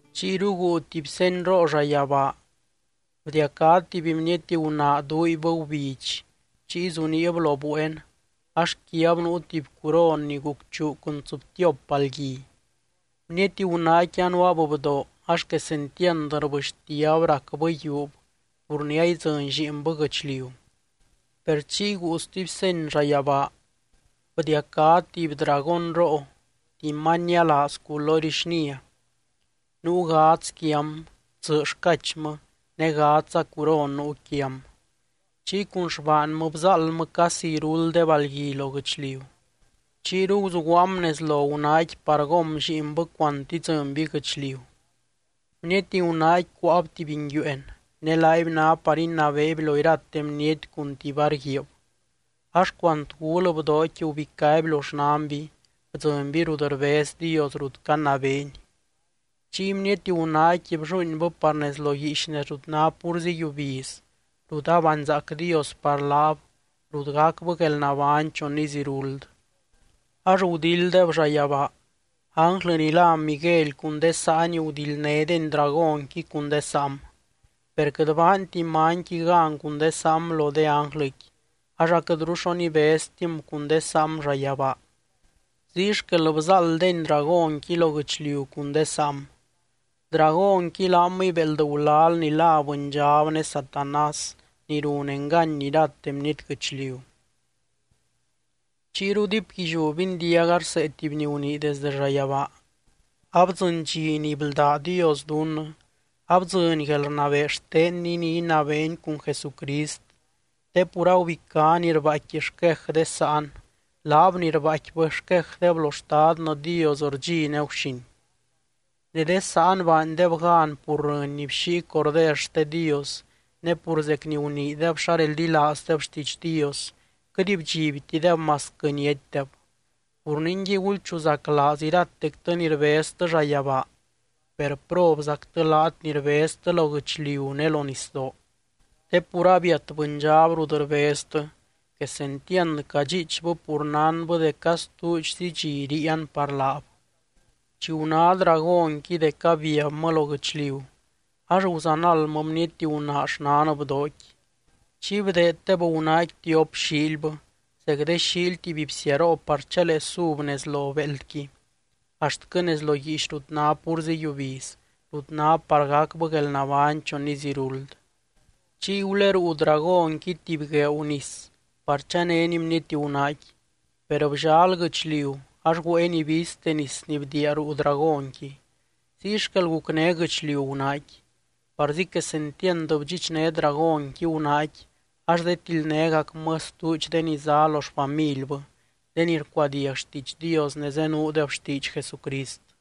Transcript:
Chiyru guu tuby senyroo llayabaa. Bdiacá tuby bniety gunaa duuibbɨ gubidx, chiy zuniib lo bueen ax quiab nuu tuby curon ni gucchuu cun tsɨbtiop balgui. Bniety gunaaqui anuaab bdoo ax quesentiand rbɨxtiab racbɨ yiuub pur ni aidzɨny lliinbɨ guɨchliu. Per chiy guu stuby seny llayabaa. Bdiacá tuby dragónroo, tuby many nialaaz culory xnia. Nuu gadz quiam, tsɨ xcachmɨ ne gadzza curon nuu quiam. Chiy cun xbaanmɨ bzáaldmɨ casi iruld de balgui lo guɨchliu. Chiyru guzuguaam nez lo gunaaqui par gom lliinbɨ cuant idzɨnby guɨchliu. Bniety gunaaqui cuáab tuby nguiueen, ne laaby ná par inabeeby lo irate bniety cun tuby var guiib. Ax cuant gul bdooqui gubicáby lo xnanby, bdzɨnby rut rbez Dios, rut canabeeny. Chiy bniety gunaaqui blluuinbɨ par nez lo guiix nez rut ná púrzi yiubiz, rut abanzaac Dios par laab, rut gacbɨ guelnabány chon iz iruld. Ax gudilddeb llayabaa, ánglɨ ni lá Miguely cun de saany gudildnédeny dragónqui cun de saam. Per quɨt baanti manyqui gan cun de saam lo de ánglɨqui, ax aquɨtru xo nibeztim cun de saam llayabaa. Ziy xquel bzáalddeny dragónqui lo guɨchliu cun de saam. Dragónqui laamɨy béeld gulal ni lá Bɨndxab ne Satanás ni run engany irate bniety guɨchliu. Chiyru diipguilliú bindiaga rsee tuby ni gunii desdɨ llayabaa: —Abdzɨny dxi ni bldá Dios dunnɨ, abdzɨny guelrnabee xtenny ni inabeeny cun Jesucrist, te pur agubicá ni rbaaicqui xquej de sáan, laab ni rbaaicquibɨ xquejdeb lo Xtadnɨ Dios rdxi ne guxin. Ne de sáan baandeb gan pur rɨny ni bxíi Corder xte Dios ne pur zec ni guniideb xa reldilaazdeb xtiidx Dios, quɨt bdxibtideb masquɨ niatydeb. Pur ningui, gulchuzaclaaz iratectɨ ni rbeztɨ llayabaa per, ¡probzactɨ laat ni rbeztɨ lo guɨchliu ne lo nisdoo! Te pur abiat bɨndxab rut rbeztɨ, quesentiand cadxiichbɨ pur nánbɨ dec astuudxzy dxi ríian par laab. Chi guná dragónqui dec abiabmɨ lo guɨchliu, ax guzanaldmɨ bniety gunaa xnan bdooqui. Chiy bdeeddeb gunaaqui tiop xiilbɨ zec de xiily tuby bsiaroo par chalee sub nez lo béeldqui axtquɨ nez lo guiix rut ná púrzi yiubiz, rut ná par gacbɨ guelnabány chon iz iruld. Chiy guleruu dragónqui tuby gueeu nis par chanéni bniety gunaaqui. Per bllal guɨchliu ax güéeni ibizte nis ni bdiia ruu dragónqui. Ziy xquel gucné guɨchliu gunaaqui. Parzi quesentiand bdxichné dragónqui gunaaqui ax zetildnégacmɨ stuudx de ni zá lo xfamilbɨ, de ni rcuadiag xtiidx Dios ne zenuudeb xtiidx Jesucrist.